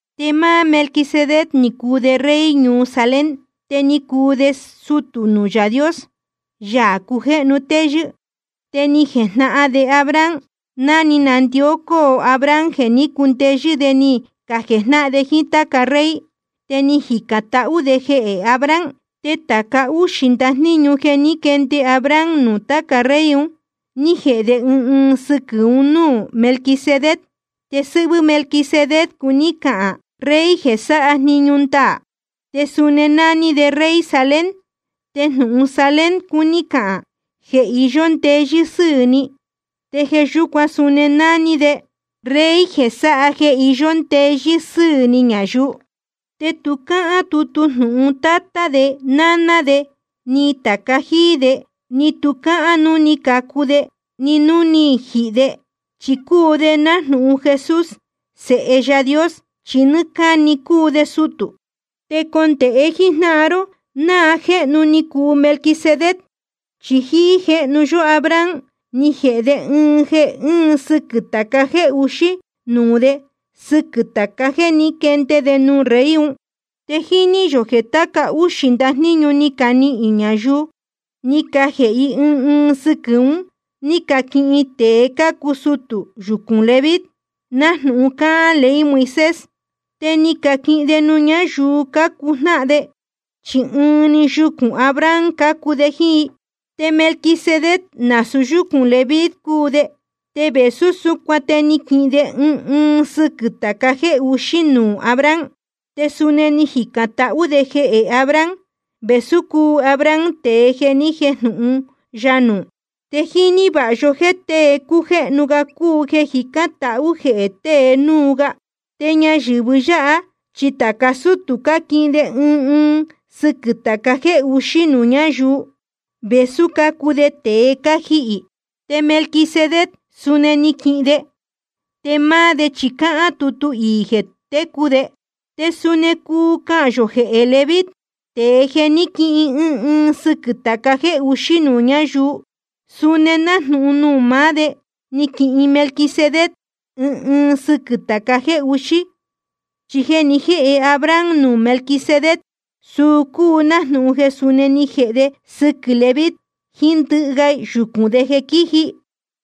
Te máá Melquisedec ni cuu de rey ñuu Salem, te ni cuu de sutū nuū Yaā Dios, Yaā cujéhnu téyɨ́. Te ni jejnahan de Abraham ná ni nandicó Abraham jeē ní cundeyɨ́ de ni cajejnáhan de jíín táca rey. Te ni jicān tahú de jehē Abraham. Te tāca úxī ndajníñu jeē ní quende Abraham nuū tāca rey un, ni jēhe de ɨɨn ɨɨn sɨquɨ̄ un núū Melquisedec. Te sɨ́hvɨ́ Melquisedec cuní cahān: rey jeē sáha jniñu ndaā. Te suni nání de rey Salem, te jnūhun Salem cuní cahān: jeē iyó ndeyɨ́ sɨ́ɨ̄ ni. Te jeē yúcuan suni nání de: rey jeē sáha jeē iyó ndeyɨ́ sɨ́ɨ̄ ni ñayuu. Te tu cáhán tutu jnūhun tátá de ni náná de ni tāca jíí de. Ni tu cáhán núu ni cacu de, ni núu ni jihī de. Chi cúu de nájnūhun Jesús, Sēhe Yaā Dios, chi nɨ́ɨ́ cáni cúu de sutū. Te condēhe jíjnáhan ró náa jéhnu ni cuu Melquisedec, chi jíí jéhnu yó Abraham ni jēhe de ɨɨn ɨɨn sɨquɨ̄ tāca jéē uxí nuū de sɨquɨ̄ tāca jéē ní quende de nuū rey un. Te jíní yō jeē tāca úxī ndajníñu ni canihīn ñayuu, ni cajēhe i ɨɨn ɨɨn sɨquɨ̄ un ní caquihin tēe cácuu sutū yucūn Leví, nájnūhun cáhán ley Moisés. Te ni caquihin de nuū ñáyuu cácuu jnáhan de, chi ɨɨn‑ni yucūn Abraham cácuu de jíín i. Te Melquisedec nasūu yúcūn Leví cúu de, te vēsú súcuan te ni quihin de ɨɨn ɨɨn sɨquɨ̄ tāca jéē uxí nuū Abraham. Te suni ni jicān tahú de jehē Abraham, vēsú cúu Abraham tēe jeē ni jéjnūhun ya nuū. Te jíní vāha yó jéē tée cújéhnu ga cúu jeē jicán tahú jehē tēe núu ga. Te ñayɨ̄vɨ yáha chi tāca sútū cáquihin de ɨɨn ɨɨn sɨquɨ̄ tāca jéē uxí nuū ñáyuu, vēsú cácuu te tēe cájihī. Te Melquisedec suni ni quihin de, te máá de chi cáhán tutu iī jeē técu de. Te suni cuu cahān yō jeē Leví, tēe jeē ní quihin ɨɨn ɨɨn sɨquɨ̄ tāca jéē uxí nuū ñáyuu, suni nájnūhun nuū maá de ni quihin Melquisedec ɨɨn ɨɨn sɨquɨ̄ tāca jéē uxí. Chi jeē ni jéhe Abraham nuū Melquisedec, suu cúu nájnūhun jeē suni ni jēhe de jeē sɨquɨ́ Leví jiín ndɨhɨ ga yucūn de jeē quíji.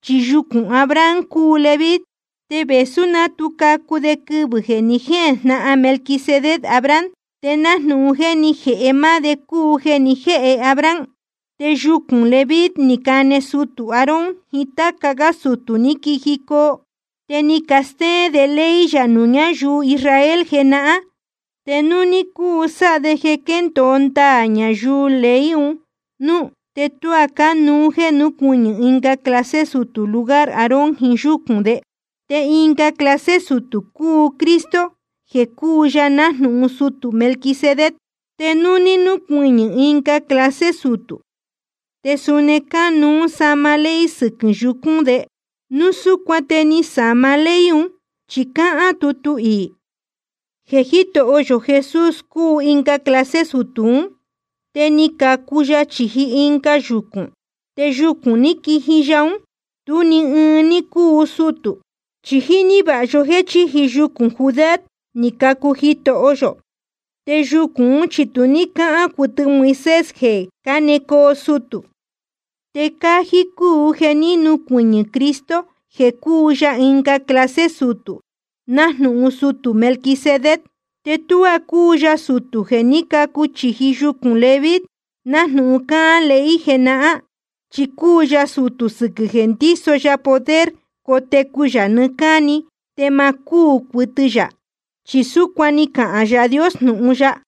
Chi yucūn Abraham cúu Leví, te vēsú ná tu cacu de quɨvɨ̄ jeē ni jéjnahan Melquisedec Abraham, te nájnūhun jeē ni jéhe máá de cúu jeē ni jéhe Abraham. Te yucūn Leví ni cane sutū Aarón jiín táca gá sutū ní quijicoo. Te ni castéén de ley yā nuū ñáyuu Israel jenahán. Te núu ní cúu sáha de jeē quendōo ndaā ñayuu jiín ley un núú, te tuá cánuú jeē núcuɨñɨ̄ ɨnga clase sutū lugar Aarón jíín yúcūn de. Te ɨnga clase sutū cúu Cristo jeē cúu ya nájnūhun sutū Melquisedec. Te núu nucuɨñɨ̄ ɨnga clase sutū, te suni cánuú sáma ley sɨquɨ̄ yucūn de. Núu súcuan te ni sāma ley un, chi cáhán tutu iī jeē Jítoho yō Jesús cúu ɨnga clase sutū ún, te ni cacu ya chīji ɨnga yucūn. Te yucūn ní quiji ya ún, tú ni ɨɨn ní cúu sutū. Chi jíní vāha yó jéē chíji yucūn Judá ni cacu Jitoho yō. Te yucūn ún chi tu ní cáhán cuɨtɨ Moisés jeē cánecoo sutū. Te cájí cúu jeē ní nucuɨñɨ̄ Cristo jeē cúu ya ɨnga clase sutū nájnūhun sutū Melquisedec. Te tu cúu ya sutū jeē ní cacu chīji yucūn Leví nájnūhun cáhán ley jenahán. Chi cúu ya sutū sɨquɨ̄ jeē ndíso ya poder cotecu yā nɨɨ́ cáni te ma cúū cuɨtɨ yā. Chi súcuan ni cahān Yaā Dios jnūhun ya: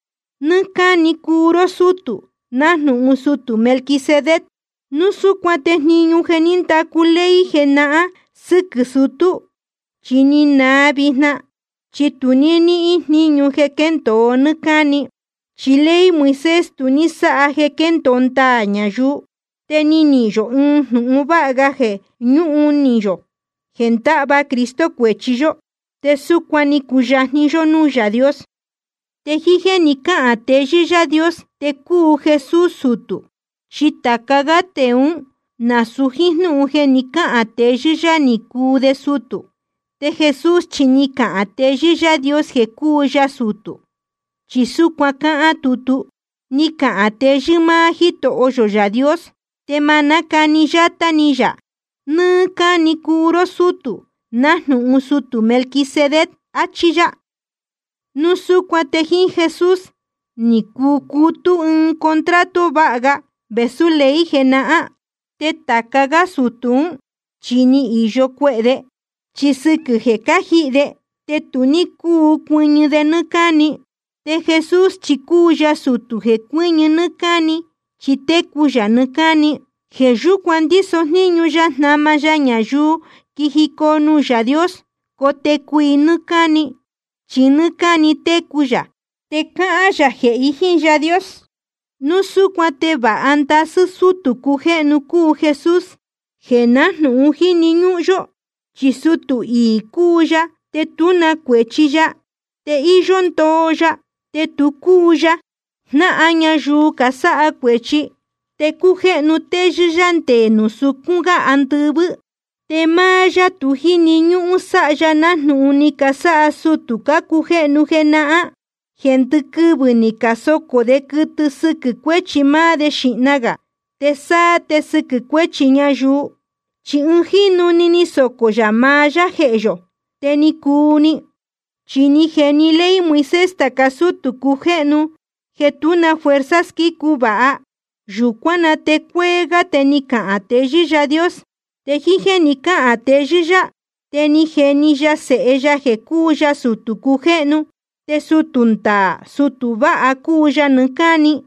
Nɨ́ɨ́ cáni cúu ró sútū, nájnūhun sutū Melquisedec. Núu súcuan te jniñu jeē ní ndacu ley jenahán sɨquɨ̄ sutū, chi ni naa vijna, chi tu ní níhín jníñu quendōo nɨ́ɨ́ cáni. Chi ley Moisés tu ní sáha jeē quéndōo ndaā ñayuu. Te ni nihīn yō ɨɨn jnūhun vāha ga jeē ñúhun ni yō jeē ndáhva Cristo cuēchi yó, te súcuan ni cuyajni yó núū Yaā Dios. Te jíín jéē ni cáhān teyɨ́ Yaā Dios te cúu Jesús sutū. Chi tāca gá tēe ún, nasūu jíín jnúhun jeē ni cáhān teyɨ́ yá ní cúu de sutū. Te Jesús chi ni cahān teyɨ́ Yaā Dios jeē cuu ya sutū, chi súcuan cáhán tutu: Ni cahān teyɨ́ máá Jítoho yō Yaā Dios, te ma nácani yátá ni yā: Nɨ́ɨ́ cáni cúu ró sútū, nájnūhun sutū Melquisedec. Achí yá. Núu súcuan te jíín Jesús ni cucutú ɨɨn contrato vāha ga vēsú ley jenahán. Te tāca gá sutū ún, chi ni īyo cuehē de, chi sɨquɨ̄ jeē cájihī de te tu ní cúu cuɨñɨ de nɨ́ɨ́ cáni. Te Jesús chi cúu ya sutū jeē cuɨñɨ nɨ́ɨ́ cáni, chi técu yā nɨɨ́ cáni. Jeē yúcuan ndíso jníñu ya jnama ya ñayuu quíjicoo nuū Yaā Dios, cotecu i nɨ́ɨ́ cáni. Chi nɨ́ɨ́ cáni técu yā te cáhán yā jehē i jíín Yaā Dios. Núu súcuan te vāha ndasɨ́ sutū cujéhnu cúu Jesús, jeē nájnūhun jíni ñúhún yó. Chi sutū iī cúu ya, te tú na cuēchi ya, te íyó ndoo ya, te tu cúu ya jnáhan ñayuu casáha cuēchi, te cújéhnu téyɨ́ yá nde nuū sucún gá andɨvɨ́. Te máá yá tu jíni ñúhún sáha ya nájnūhun ni casáha sutū cácujéhnu jenahán, jeē ndɨquɨvɨ̄ ni casocō de quɨtɨ sɨquɨ̄ cuēchi máá de xīhna gā, te sáá te sɨquɨ̄ cuēchi ñayuu. Chi ɨɨn jínu‑ni ni socō yā maá yá jehē yō, te ni cuu‑ni. Chi ni jeni ley Moisés tāca sútū cujéhnu jeē tú na fuerza squícu vāha. Yūcuán na te cuéé gá te ni cahān teyɨ́ Yaā Dios. Te jíín jéē ni cáhān teyɨ́ yá, te ni jeni ya Sēhe ya jeē cúu ya sutū cujéhnu, te sutū ndaā sutū vāha cúu ya nɨɨ́ cáni.